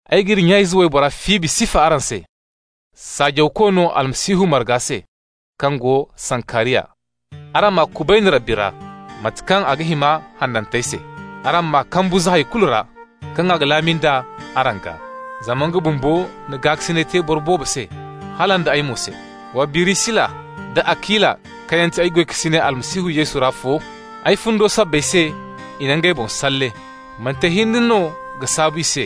Ay g'iri nya-ize waybora Fibi sifa araŋ se, saajawko no Almasihu marga se kaŋ go Sankariya. Araŋ m'a kubayni Rabbi ra, mate kaŋ a ga hima hanantey se. Araŋ m'a kambu za hay kulu ra kaŋ a ga laami nd'a araŋ gaa. Zama nga bumbo na gaakasinay te boro boobo se, hala nda ay mo se. Wa Birisila da Akila kaŋ yaŋ ti ay goykasiney Almasihu Yesu ra fo. Ay fundo sabbay se i na ngey boŋ salle. Manti ay hinne no ga saabu i se,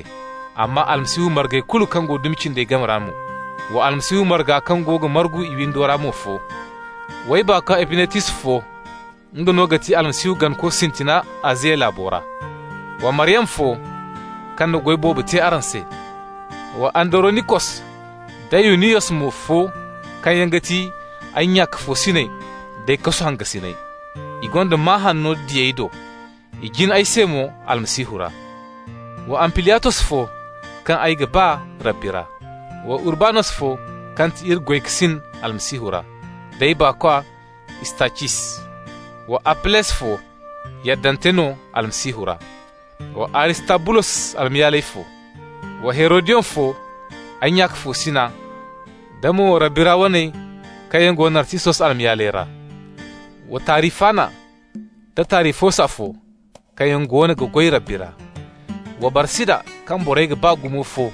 amma Almasihu margey kulu kaŋ go dumi cindey game ra mo. Wa Almasihu marga kaŋ go ga margu i windo ra mo fo. W'ay baakwa Epinetus fo. Nga no ga ti Almasihu ganako sintina Aziya laabo ra. Wa Maryama fo, kaŋ na goy boobo te araŋ se. Wa Andaronikos da Yuniyos mo fo kaŋ yaŋ ga ti ay nya-ka-fo-siney d'ay kasu hangasiney. I gonda maa hanno diyey do. I jin ay se mo Almasihu ra. Wa Ampliyatos fo, kaŋ ay ga ba Rabbi ra. Wa Urbanos fo kaŋ ti iri goykasin Almasihu ra, d'ay baakwa Istacis. Wa Appeles fo, yaddante no Almasihu ra. Wa Aristabulos almayaaley fo. Wa Herodiyon fo, ay nya-ka-fo-sina, da mo Rabbi ra waney kaŋ yaŋ go Narsisos almayaaley ra. Wa Tarifana da Tarifosa fo, kaŋ yaŋ goono ga goy Rabbi ra. Wa Barsida kaŋ borey ga ba gumo fo,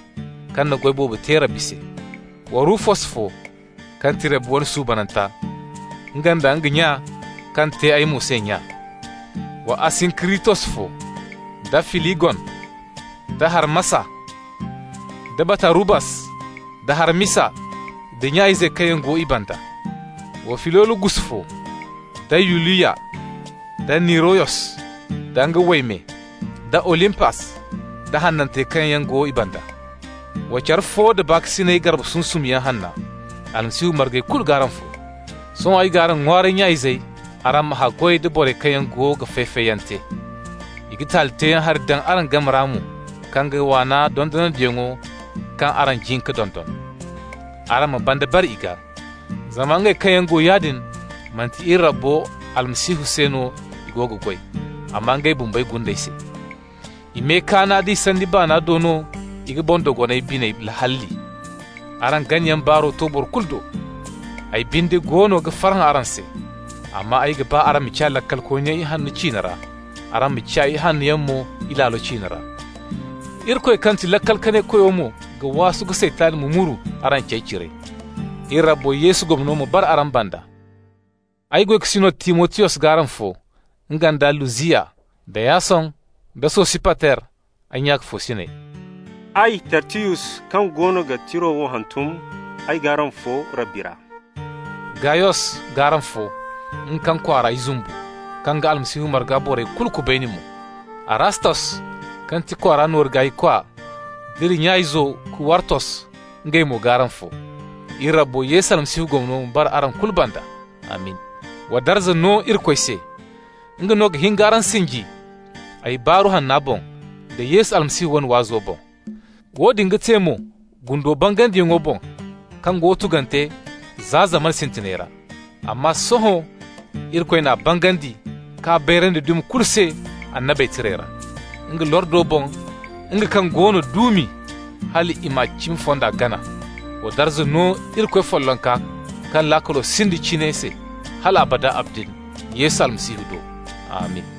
kaŋ na goy boobo te Rabbi se. Wa Rufus fo, kaŋ ti Rabbi wane suubananta, nga nda nga nya, kaŋ te ay mo se nya. Wa Asinkiritos fo, da Filigon, da Harmasa, da Batarubas, da Harmisa, da nya-izey kaŋ yaŋ go i banda. Wa Filologus fo, da Yuliya, da Niriyos da nga wayme, da Olimpas, da hanantey kaŋ yaŋ go i banda. Wa care fo da baakasinay garbe sunsumyaŋ hanna. Almasihu margey kulu g'araŋ fo. Sohõ ay g'araŋ ŋwaaray, nya-izey, araŋ ma haggoy da borey kaŋ yaŋ go ga fay-fayyaŋ te. I ga taali teeyaŋ hari daŋ araŋ game ra mo kaŋ ga waana dondonandiyaŋo kaŋ araŋ jin ka dondon. Araŋ ma banda bare i gaa. Zama ngey kaŋ yaŋ go yaadin, manti iri Rabbo Almasihu se no i go ga goy, amma ngey bumbey gundey se. I me kaana da i sanni baana do no i ga boŋ-dogonay biney halli. Araŋ ganayaŋ baaro to boro kulu do. Ay binde goono ga farhã araŋ se. Amma ay ga ba araŋ ma ciya laakalkooniyaŋ ihanno ciine ra, araŋ ma ciya ihannoyaŋ mo ilaalo ciine ra. Irikoy kaŋ ti Laakal-Kanay-Koyo mo ga waasu ka Saytan mumuru araŋ cey cire. Iri Rabbo Yesu gomno ma bara araŋ banda. Ay goykasino Timotiyos g'araŋ fo, nga nda Lusiyas, da Yason, da Sosipater, ay nya-ka-fo-siney. Ay Tertiyus kaŋ goono ga tira wo hantum, ay g'araŋ fo Rabbi ra. Gayos g'araŋ fo, nga kaŋ kwaara ay zumbu, kaŋ ga Almasihu marga borey kulu kubayni mo. Arastos kaŋ ti kwaara nooru gaaykwa, d'iri nya-izo Kuwartos, ngey mo g'araŋ fo. Iri Rabbo Yesu Almasihu gomno ma bara araŋ kulu banda. Amin! Wa darza no Irikoy se! Nga no ga hin k'araŋ sinji, ay Baaru Hanna boŋ, da Yesu Almasihu wane waazo boŋ. Woodin ga te mo gundo bangandiyaŋo boŋ kaŋ go tugante za zamana sintinayey ra. Amma sohõ Irikoy n'a bangandi k'a bayrandi dumi kulu se annabey tirey ra, nga lordo boŋ, nga kaŋ go no duumi, hal i ma cimi fonda gana. Wa darza no Irikoy follonka kaŋ laakalo sinda cine se hal abada abadin Yesu Almasihu do! Amin!